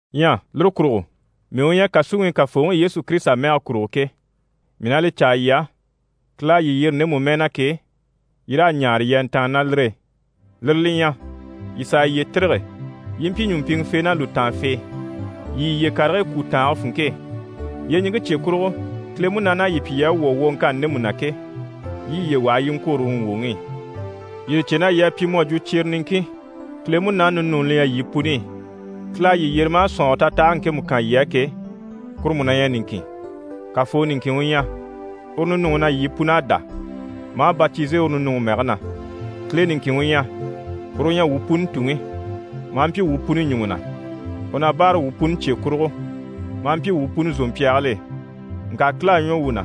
Ɲyɛ lire kurugo, mii u ɲyɛ kàsuŋi i Kafooŋi Yesu Kirisita mɛge kurugo ke, mii na li caa yii á, Kile à yii yyere ndemu mɛɛ na ke, yii raa ɲaare yii a ntàanni ná lire e. Lire li ɲyɛ, yii sàa yiye tîrige, yii i mpyi ɲùmpiŋɛfee ná lùtaanfee, yii yiye karigii kwú tàange funŋke e. Yyeɲiŋke cye kurugo, Kile Munaani à yii pyi yii à wwɔ̀ wwoŋkanni ndemu na ke, yii yiye waha yii i ŋkwôro uru ŋgwòŋi i. Yii li cè na yii à pyi mu à jwo cyere niŋkin, Kile Munaani ninuuni li ɲyɛ yii puni i. Kile à yii yyere maa sɔ̀nŋɔre tatahage ŋkemu kan yii á ke, kuru mú na ɲyɛ niŋkin. Kafoo niŋkin u ɲyɛ, uru ninuŋi na yii pun'à dá, maa batize uru ninuŋi mɛgɛ na. Kile niŋkin u ɲyɛ, uru u ɲyɛ wuu puni Tuŋi, maa mpyi wuu puni ɲùŋɔ na, u na báaraŋi pyi wuu puni cye kurugo, maa mpyi wuu puni zòmpyaagil'e. Ŋka Kile à ɲwɔ wuu na,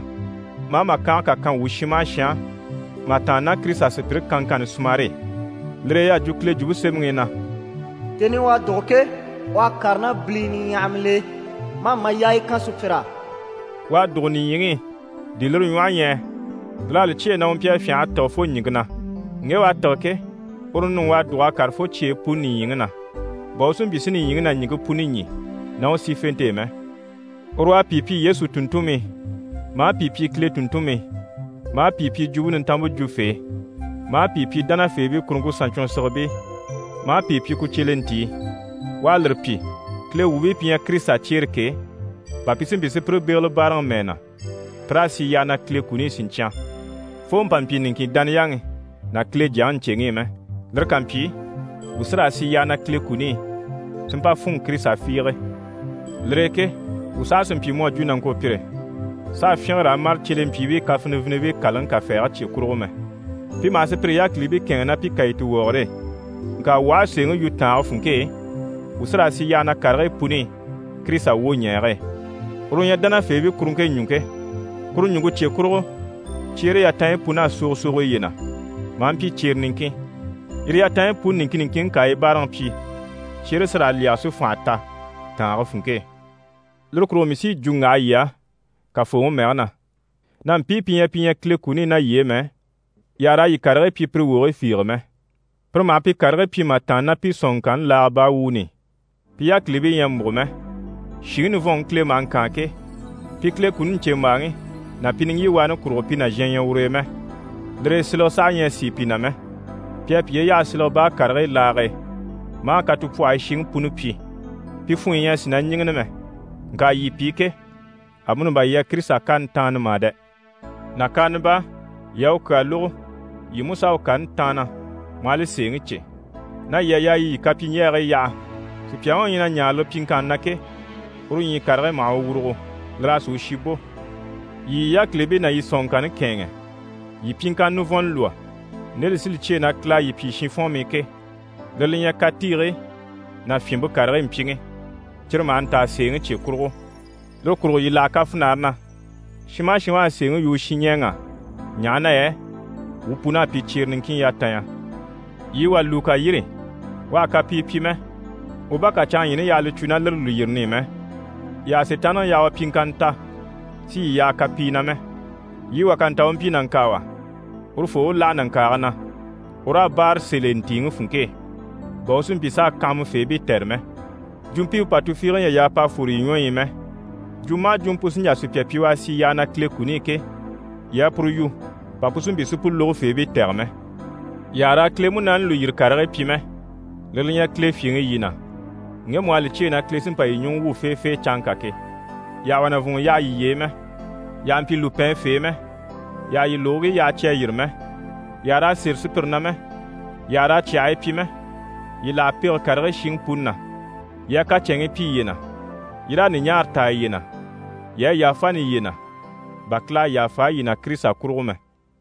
maa màkange kà kan wuu shin maha shin á mà tàanna ná Kirisita sùpyire kanŋkanni sumare e. Lire e y'à jwo Kile Jwumpe Semɛŋi i na: «Tèni i u à dùgo ke, u à kàre ná bilii niɲyahamil'e, maa mayaaya kan sùpyir'á.» U à dùgo nìɲyiŋi i, di lire ɲwɔhe ɲyɛ yɛ? Lir'à li cyêe na u mpyi a fyânha a tîge fo ɲìŋke na. Ŋge u à tîge ke, uru ninuŋi u à dùg'a kàre fo cyeyi puni nìɲyiŋi na, bà u si mpyi si nìɲyiŋi ná ɲìŋke puni ɲî ná u sífente e mɛ. Uru u à pìi pyi Yesu tùnntunmii, maa pìi pyi Kile tùnntunmii, maa pìi pyi Jwumpe Nintanmpe jwufee, maa pìi pyi dánafeebii kuruŋke saɲcwɔnsigibii, maa pìi pyi ku cyelentii. U à lire pyi, Kile wuubii pi ɲyɛ Kirisita cyeere ke, bà pi si mpyi si pire bégele báaraŋi mɛɛ na, pi raa sì yyaha na Kile kuni i siɲcyan, fo mpa mpyi niŋkin dániyaŋi ná Kile Jyaŋi ɲcèŋi i mɛ. Lire ká mpyi, wuu sí raa sì yyaha na Kile kuni i, si mpa fûnŋɔ Kirisita fiige. Lire e ke wuu saha sì n‑pyi mu à jwo nàŋkopyire s'a fyínge raa mâre cyelentiibii kafinivinibii kàlaŋi kafɛɛge cye kurugo mɛ. Pi maha sùpyire yákilibii kɛ̂ɛnŋi ná pi kàyituwɔgɔre e. Ŋka wuu aha a sèeŋi yu tàange funŋke e, wuu sí raa sì yyaha na karigii puni i Kirisita wwoɲɛɛge e. Uru u ɲyɛ dánafeebii kuruŋke ɲùŋke. Kuru ɲùŋke cye kurugo, cyeere yatanɲyi pun'à sogo sogo yiye na, maa mpyi cyere niŋkin. Yire yatanɲyi puni niŋkin niŋkinŋi ká a yi báaraŋi pyi, cyeere sí raa lyɛge si fànha ta tàange funŋke e. Lire kurugo mii sí yi jwo n‑waha yii á Kafooŋi mɛge na na mpii pi ɲyɛ pi ɲyɛ Kile kuni i ná yii e mɛ, yii àha raa yii karigii pyi pire wogigii fiige mɛ. Pire maha pi karigii pyi mà tàanna ná pi sɔ̀nŋɔŋkanni laaga baa wuuni i. Pi yákilibii ɲyɛ a múgo mɛ, shìŋi nivɔnŋi Kile maha ŋkaan ke, pi Kile kuni ɲcèmbaaŋi ná pi niŋgyiwaani kurugo pi nàzhan ɲyɛ ur'e mɛ. Lire e silege saha ɲyɛ a sìi pi na mɛ, pi à piye yaha silege baa karigii laage e, maa katupwɔhɔyi shiŋi puni pyi. Pi funɲyi ɲyɛ a sìi na ɲíŋini mɛ. Ŋka yii pi ke, amuni bà yii à Kirisita kani taanna mà dɛ! Nàkaana baa yii à u kyaa lógo, yii mú s'à u kani taanna maa li sèeŋi cè, na yii à yaa yii yii kapyiɲjyɛgigii yaha. Sùpyaŋi u ɲyɛ na ɲaare lire pyiŋkanni na ke, uru ɲyii karigii maha u wurugo, lir'a sì u shi bò. Yii yii yákilibii ná yii sɔ̀nŋɔŋkanni kɛ̂ɛnŋɛ. Yii pyiŋkanna nivɔnnɔ lwɔ́, nde li sí li cyêe na Kile à yii pyi shinfɔnmii ke. Lire li ɲyɛ, katiigii ná fyìnmpe karigii mpyiŋi, cyire maha ntaa sèeŋi cye kurugo. Lire kurugo yii láha kafinare na, shin maha shin u à sèeŋi yu u shinɲɛɛŋ'á, ɲaha na yɛ wuu pun'à pyi cyere niŋkin yatanya. Yii wà lùu ká yîri, u àha kapii pyi mɛ, u bá kà canŋaɲyiini yaha li cwo ná lire lùyirini i mɛ. Yii àha Sitaanniŋi yaha u pyiŋkanna ta si yii yaha kapii na mɛ. Yii wà ká nta u mpyi nàŋkaawa, urufoo u láha nàŋkaage na, u raa báare sèl'e ntìiŋi funŋke e, bà u si mpyi s'a kanhamafeebii tɛ̀re mɛ. Jwumpimpe pà tufiige ɲyɛ a yaa p'a fwore yii ɲwɔyi i mɛ. Jwumɔ maha jwumɔ pu sí n‑jà sùpya pyi u a sì yyaha na Kile kuni i ke, yii a puru yu bà pu si mpyi si pu lógofeebii tɛ̀gɛ mɛ. Yii àha raa Kile Munaani lùyiri karigii pyi mɛ. Lire li ɲyɛ Kile fyèŋi yii na, ŋgemu u à li cyêe na Kile sí n‑pa yii ɲùŋɔ wwû feefee canŋka ke. Yii àha wà nàvunŋɔ yaha yiye e mɛ, yii àha mpyi lùpɛɛnfee mɛ, yii àha yii lùgigii yaha cyi à yîri mɛ, yii àha raa sêre sùpyire na mɛ, yii àha raa cyàhii pyi mɛ. Yii láha pege karigii shiŋi puni na. Yii a kacɛnŋii pyi yiye na, yii raa ɲùɲaara taa yiye na, yii a yàfani yiye na, bà Kile à yàfa yii na Kirisita kurugo mɛ.